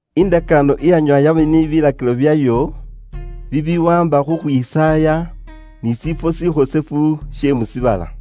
Indakaano iyanyoowa yaba ni bilakilo byayo bibiwaamba khu khwisaaya ni shifwo shifuura bukhosefu she mu shiibala.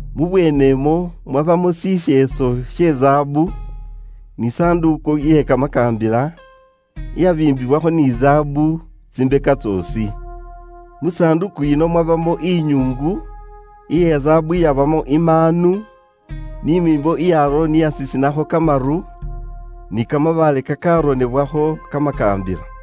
Mubweenemwo mwabamo shisheeso she zaabu, ni sanduuku iye'ndakaano iyabiimbiwakho ni zaabu tsimbeka tsoosi. Mu sanduuku yino mwabamo inyuungu iye zaabu iyabamo imaanu ni miimbo ya Aroni iyasisinakho kamaru, ni kamabaale kakaronebwakho kamakaambila.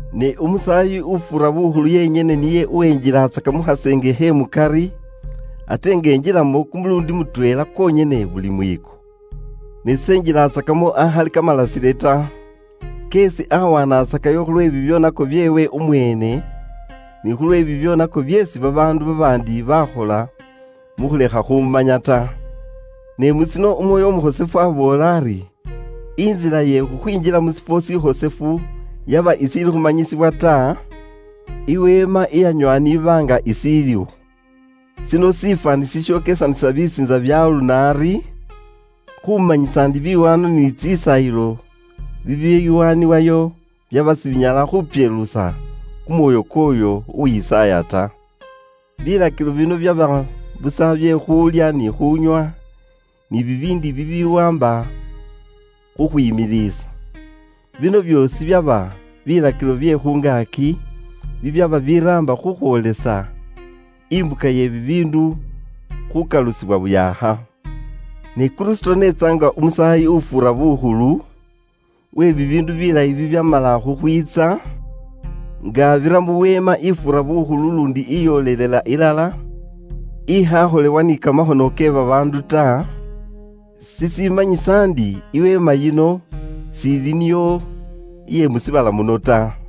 Ne umusaayi ufuura bukhulu yenyene niye uwenjilatsaka mu khaseenge khe mukari ate nga enjilamo kumuluundi mutweela kwonyene buli mwiiko. Ne s'enjilatsakamo akhali ni kamalasile ta, keesi awanatsakayo khulwe bibyoonako byeewe umweene, ni khulwe bibyoonako byeesi babaandu babaandi baakhola mu khulekha khumanya ta. Ne mu shino Umwoyo Umukhosefu aboola ari, intsila ye khukhwinjila mu shifwo shifuura bukhosefu yaba ishiili khumanyisibwa ta, iweema iyanyoowa n'iba nga ishiliwo. Shino shifwaani shishokesanisa bisiintsa bya aluno ari, khumanyisa ndi biwaanwa ni tsisaayilo bibiwaanibwayo byaba sibinyala khupyeluusa kumwoyo kwooyo uwisaaya ta. Bilakilo bino byaba busa bye khuulya ni khuunywa, ni bibiindi bibiwaamba khu khupyeluusa kimibili. Bino byoosi byaba bilakilo bye khu ngaaki bibyaba biraamba khukhwoolesa imbuka ye bibiindu khukalusibwa bushaakha. Ne Kristo n'etsa nga umusaayi ufuura bukhulu, uwe bibiindu bilayi bibyamala khukhwiitsa, nga abira mu weema ifuura bukhulu luundi iyoolelela ilala, ikhaakholewa ni kamakhono kye babaandu ta, shishimanyisa ndi, iweema yino shiili niyo iye mu shiibala muno ta.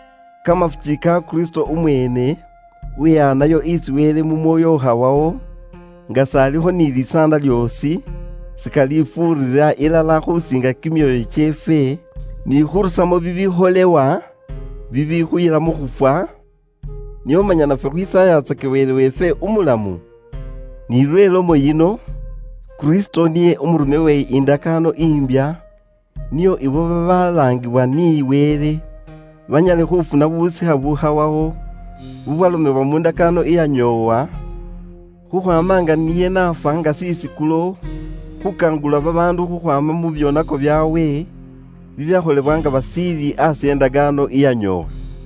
kamafuki ka Kristo umweene uwehaanayo isi Wele mu Mwoyo ukhawawo, nga s'alikho ni likoondo lyoosi, shikalifuurira ilala khusiinga kimyoyo kyeefwe ni khurusamo bibikholewa bibikhuyila mu khufwa, nio manya nafwe khwisaayatsake Wele weefwe Umulamu ta? Ni lwe lomo yino, Kristo niye umurume we ndakaano imbya nio ibo babaalaangibwa ni Wele banyale khufuna busikha bukhawawo bweesi babalomela mu ndakaano iyanyoowa, khukhwaama nga niye n'afwa nga shisikulo khuwonesa babaandu khukhwaama mu byoonako byaabwe, bibyakholebwa nga bashiili aasi e ndakaano iyanyoowa.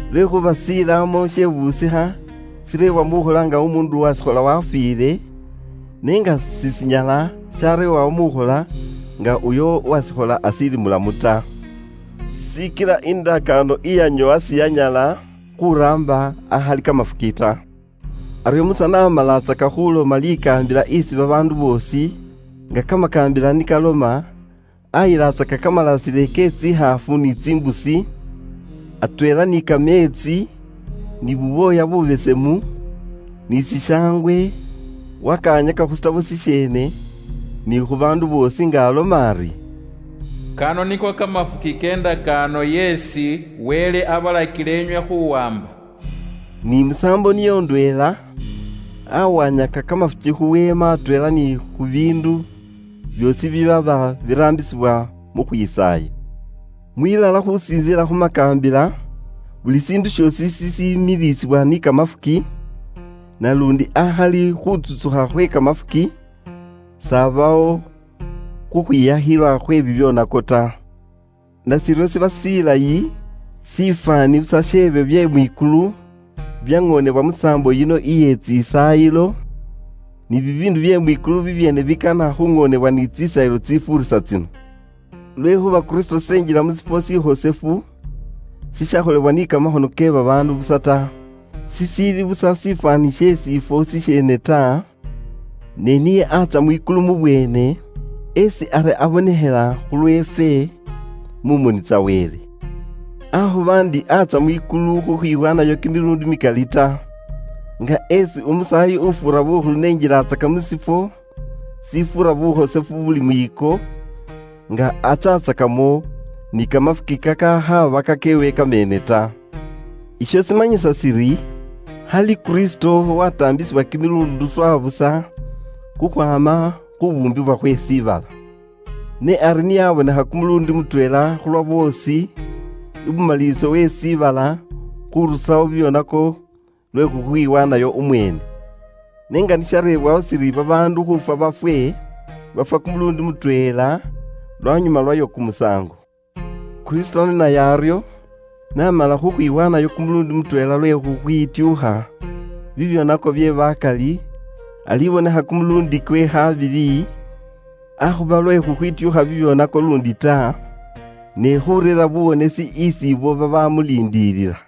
Lwekhuuba indakaano iye shilaamo she busikha shireebwa mukhola nga umuundu uwashikhola wafiile, ne nga sishinyala shareebwa mukhola nga uyo uwashikhola ashiili mulamu ta. Shikila indakaano iyanyoowa siyanyala khuraamba akhali kamafuki ta. Aryo Musa wasontsoola babaandu buli likaambila liliili mu makaakambila ni liloma. Nio lwaanyuma wabukula kamalasile ke tsikhaafu ni tsimbusi, atweela ni kameetsi, ni bubwooya bubesemu, ni shishangwe, wakawanyaka khu burone bweene, ni khu baandu boosi, nga aloma ari, “Kano niko kamafuki ke ndakaano yeesi Wele abalakila inywe khuwaamba.” Ni musaambo niyo ndweela, awanyaka kamafuki khu weema atweela ni khu biindu byoosi bibyaba biraambisibwa mu khwisaaya. Mwilala khulondekhana ni kamakaambila, buli shiindu shoosi shipyeluusibwa ni kamafuki, naluundi akhali khuutsukha kamafuki, s'abawo khukhwiyakhilwa khwe bibyoonako ta. Nashiryo shiba shilayi shifwaani busa sh'ebyo bye mwikulu byaŋoonebwa musaambo yino iye tsisaayilo, ne bibiindu bye mwikulu bibyeene bikana khuŋoonebwa ni tsisaayilo tsitsifuurisa tsino. Lwekhuuba Kristo s'enjila mu shifwo shifuura bukhosefu shishakholebwa ni kamakhono kye babaandu busa ta, shishiili busa shifwaani she shiifwo shisheene sha ŋali ta, ne niye atsya mwikulu mubweene, esi ari abonekhela khulweefwe mu moni tsa Wele. Akhuba ndi atsya mwikulu khukhwiwaanayo kimiluundi mikali ta, nga esi umusaayi ufuura bukhulu n'enjilaatsaka mu shiifwo shifuura bukhosefu buli mwiiko, nga atsyatsakamo ni kamafuki kakakhaaba kakeewe kameene ta. Isho shimanyisa shiri khali Kristo wataambisibwa kimiluundi swa busa khukhwaama khu khubuumbibwa khwe shiibala. Ne ari niye abonekha kumuluundi mutweela khulwa boosi ibumaliliso we shiibala khurusawo bibyoonako lwe khukhwiwaanayo umweene. Ne nga ni shareebwawo shiri babaandu khuufwa bafwe, bafwa kumuluundi mutweela, lwanyuma lwayo kumusaango. Kristo naye aryo, n'amala khukhwiwaanayo kumuluundi mutweela lwe khukhwityuukha bibyoonako bye bakali, alibonekha kumuluundi kwe khabili, akhuba lwe khukhwityuukha bibyoonako luundi ta, ne khureera buwonesi isi ibo babamuliindilila.